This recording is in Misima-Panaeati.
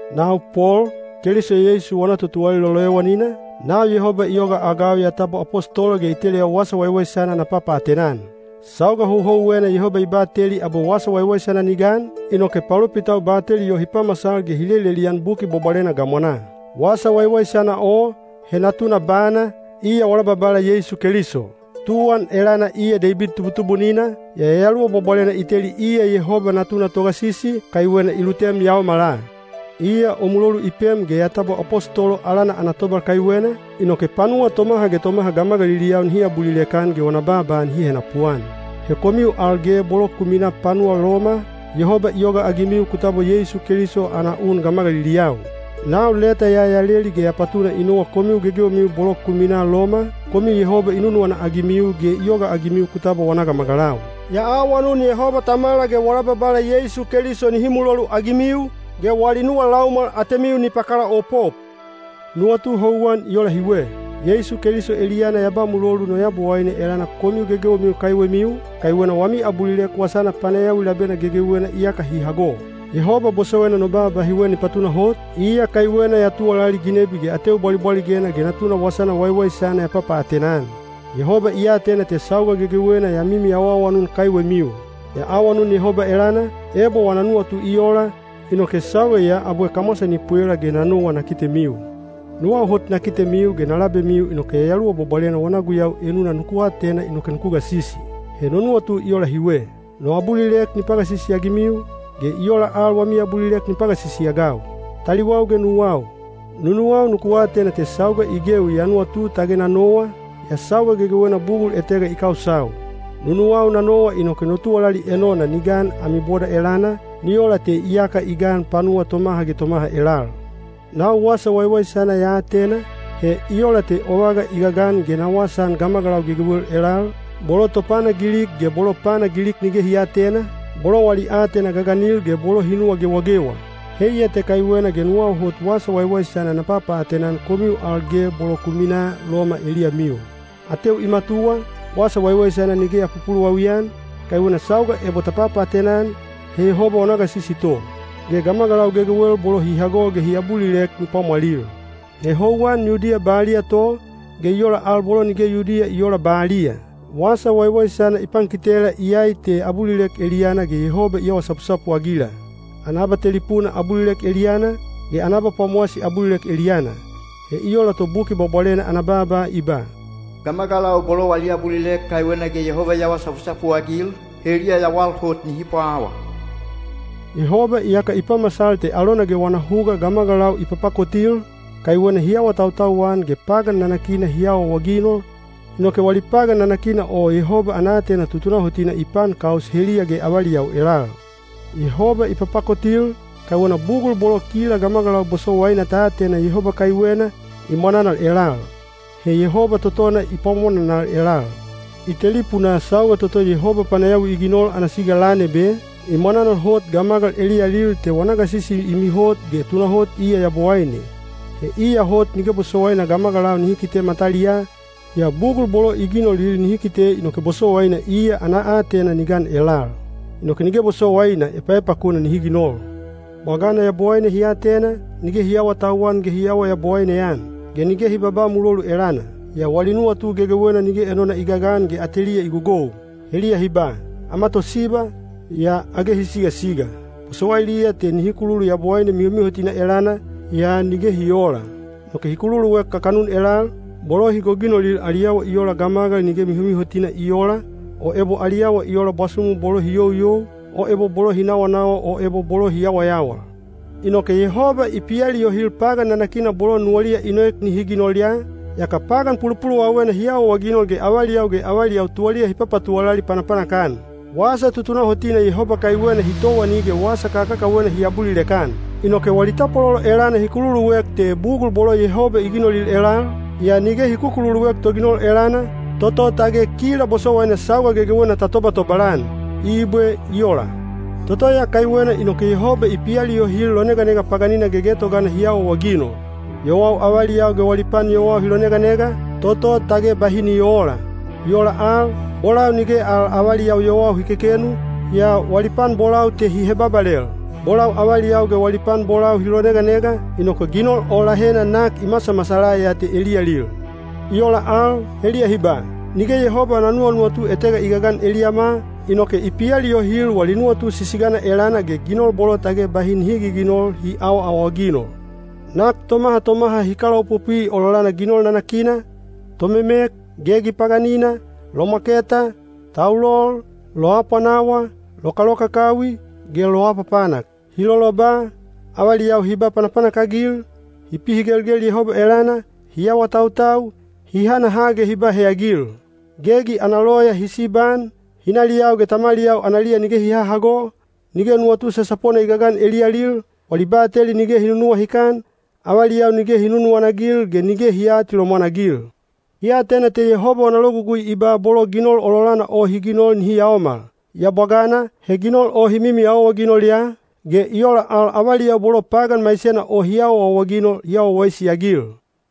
Nau Pol, Keliso Yeisu wana totuwalali loloyowanina, nau Yehoba i yogaagau ya tabwa apostolo ge i teleyau Wasa Waiwaisana na papaatena-an. Sauga houhouwena Yehoba i bateli abwe Wasa Waiwaisana ni gan, inoke palopitau bateli o hi pamasal ge hi lelelian Buki Bwabwalena gamwanaa. Wasa Waiwaisana o, he Natuna bana, iya wala Babala Yeisu Keliso. Tuwan elana iya Deibid tubutubunina, yaa Yayaluwa Bwabwalena i teli iya Yehoba Natuna Togasisi, kaiwena i lutem yaomala. Iya o mulolu i pem ge ya tabwa apostolo alana ana tobal kaiwena, inoke panuwa tomaha ge tomaha gamagaliliyau nihi abulilek-an ge wana baaba nihi henapuan. He komiu al ge bolo ku minaa panuwa Loma, Yehoba i yogaagimiu ku tabwa Yeisu Keliso ana un gamagaliliyau. Nau leta ya ya leli ge ya patuna i nowa komiu gegewemiu bolo ku minaa Loma, komiu Yehoba i nunuwana-agimiu ge i yogaagimiu ku tabwa wana gamagalau. Ya awanun Yehoba Tamala ge wala Babala Yeisu Keliso nihi muloluagimiu, ge wali nuwa laumwal atemiu ni pakalaopop. Nuwatu houwan i ola hiwe: Yeisu Keliso eliyana ya ba mulolu no Yabowaine elana komiu gegewemiu kaiwemiu, kaiwena wami abulilek wasana panayawi labena gegewena iyaka hi hago. Yehoba bosowaina no baaba hiwe ni patunahot, iya kaiwena ya tuwalali ginebi ge ateu bwalibwaligena ge Natuna Wasana Waiwaisana ya papaatena-an. Yehoba i atena te sauga gegewena ya mimi awaawanun kaiwemiu. Ya awanun Yehoba elana, ebo wana nuwatu i ola, inoke sauga ya abwe kamwasa ni pwela ge na nowa na kitemiu. Nuwau hot na kitemiu ge na labemiu inoke Yayaluwa Bwabwalena wana guyau enuna nuku atena inoke nuku gasisi. He no nuwatu i ola hiwe: no abulilek ni pagasisi-agimiu, ge i ola al wami abulilek ni pagasisi-agau. Taliwau ge nuwau, nunuwau nuku atena te sauga i gewi ya nuwatu tage na nowa, yaa sauga gegewena bugul etega i kausau. Nunuwau na nowa inoke no tuwalali enona ni gan ami boda elana, ni ola te iyaka i gan panuwa tomaha ge tomaha elal. Nau Wasa Waiwaisana ya atena, he i ola te o vaga i gagan ge na wasaan gamagalau gegewel elal, bolo topana Gilik ge bolo pana Gilik nige hi aatena, bolo wali aatena gaganil ge bolo hi nuwa gewagewa. Heiya te kaiwena ge nuwau hot Wasa Waiwaisana na papaatena-an komiu al ge bolo ku minaa Loma eliyamiu. Ateu i matuwa, Wasa Waiwaisana nige ya pupuluwawi-an, kaiwena sauga ebo ta papaatena-an, he Yehoba wana gasisi to, ge gamagalau gegewel bolo hi hago ge hi abulilek ni pwamwalil. He houwan Yudiya baliya to, ge i ola al bolo nige Yudiya i oola baliya. Wasa Waiwaisana i pankitela iyai te abulilek eliyana ge Yehoba i awa sapusapu-agila: ana abatelipuna abulilek eliyana, ge ana abapwamowasi abulilek eliyana. He i ola to Buki Bwabwalena ana baaba, i ba, “Gamagalau bolo wali abulilek kaiwena ge Yehoba i awa sapusapu-agil, heliya yawal hot nihi pwawa.” Yehoba iyaka i pamasal te alona ge wana huga gamagalau i papakotil, kaiwena hi awatautau-an ge pagan nanakina hi awaawaginol, inoke wali pagan nanakina o Yehoba ana aatena tutunahotina i paankaus heliya ge avaliyau elal. Yehoba i papakotil, kaiwena bugul bolo kila gamagalau bosowaina ta atena Yehoba kaiwena, i mwananal elal. He Yehoba totona i pwamwananal elal. I telipunaa sauga toto Yehoba panayawi i ginol ana siga lan ebe, i mwananal hot gamagal eliyalil te wana gasisi i mihot ge tunahot iya Yabowaine. He iya hot nige bosowaina gamagalau nihi kite mataliyaa, yaa bugul bolo i ginolil nihi kite inoke bosowaina iya ana aatena ni gan elal. Inoke nige bosowaina epaepakuna nihi ginol. Bwagana Yabowaine hi atena, nige hi aawatauwan ge hi aawa Yabowaine-an, ge nige hi babaa mulolu elana. Yaa wali nuwatu gegewena nige enona i gagan ge ateliya i gogou. Heliya hi ba, “Ama tosiba,” yaa age hi sigasiga. Bosowailiya te nihi kululu Yabowaine mihomihotina elana, yaa nige hi oola. Inoke hi kukululuek kakanun elal, bolo hi goginolil ali awa i ola gamagal nige mihomihotina i oola, o ebo ali awa i ola bwasumu bolo hi youyou, o ebo bolo hi nawanawa o ebo bolo hi yawayawal. Inoke Yehoba i pialiyohil pagan nanakina bolo nuwaliya i noek nihi ginol ya, yaka pagan pulupuluwawena hi awaawaginol ge avaliyau ge avaliyau tuwaliya hi patuwalali panapanak-an. Wasa tutunahotina Yehoba kaiwena hi towani ge wasa kakakawena hi abulilek-an. Inoke wali tapwalolo elana hi kululuek te bugul bolo Yehoba i ginolil elal, yaa nige hi kukululuek Toginol elana, toto tage kila bosowaina sauga gegewena ta tobatobal-an. Ibwe. I ola. Toto ya kaiwena inoke Yehoba i pialiyohil loneganega paganina gegetogana hi awaawaginol. Yowau avaliyau ge wali pan yowau hi loneganega, toto tage bahi ni oola. I ola al, bolau nige al avaliyau yowau hi kekenu, yaa wali pan bolau te hi hebabalel. Bolau avaliyau ge wali pan bolau hi loneganega, inoke ginol o lahena nak i masamasala ya te eliyalil. I ola al, heliya hi ba, “Nige Yehoba ana nuwanuwatu etega i gagan eliyama,” inoke i pialiyohil wali nuwatu sisigana elana ge ginol bolo tage bahi nihi giginol hi awaawaginol. Nak tomaha tomaha hi kalaopopwi ololana ginol nanakina, tomemek, gegi paganina, lomwaketa, taulol, loapwanawa, lokalokakawi ge loapapanak. Hi loloba, avaliyau hi ba panapanak-agil, hi pihigelgel Yehoba elana, hi awatautau, hi hanaha ge hi ba heyagil. Gegi ana loya hi sibaan, hinaliyau ge tamaliyau analiya nige hi hahago, nige nuwatu sasapona i gagan eliyalil, wali bateli nige hi nunuwahikan, avaliyau nige hi nunuwana-agil ge nige hi aatilomwan-agil. Hi atena te Yehoba wana logugui i ba bolo ginol ololana o hi ginol nihi yaomal. Yaa bwagana, he ginol o hi mimi awaawaginol ya, ge i ola al avaliyau bolo pagan maisena o hi awaawaginol hi awa wawaisi-agil.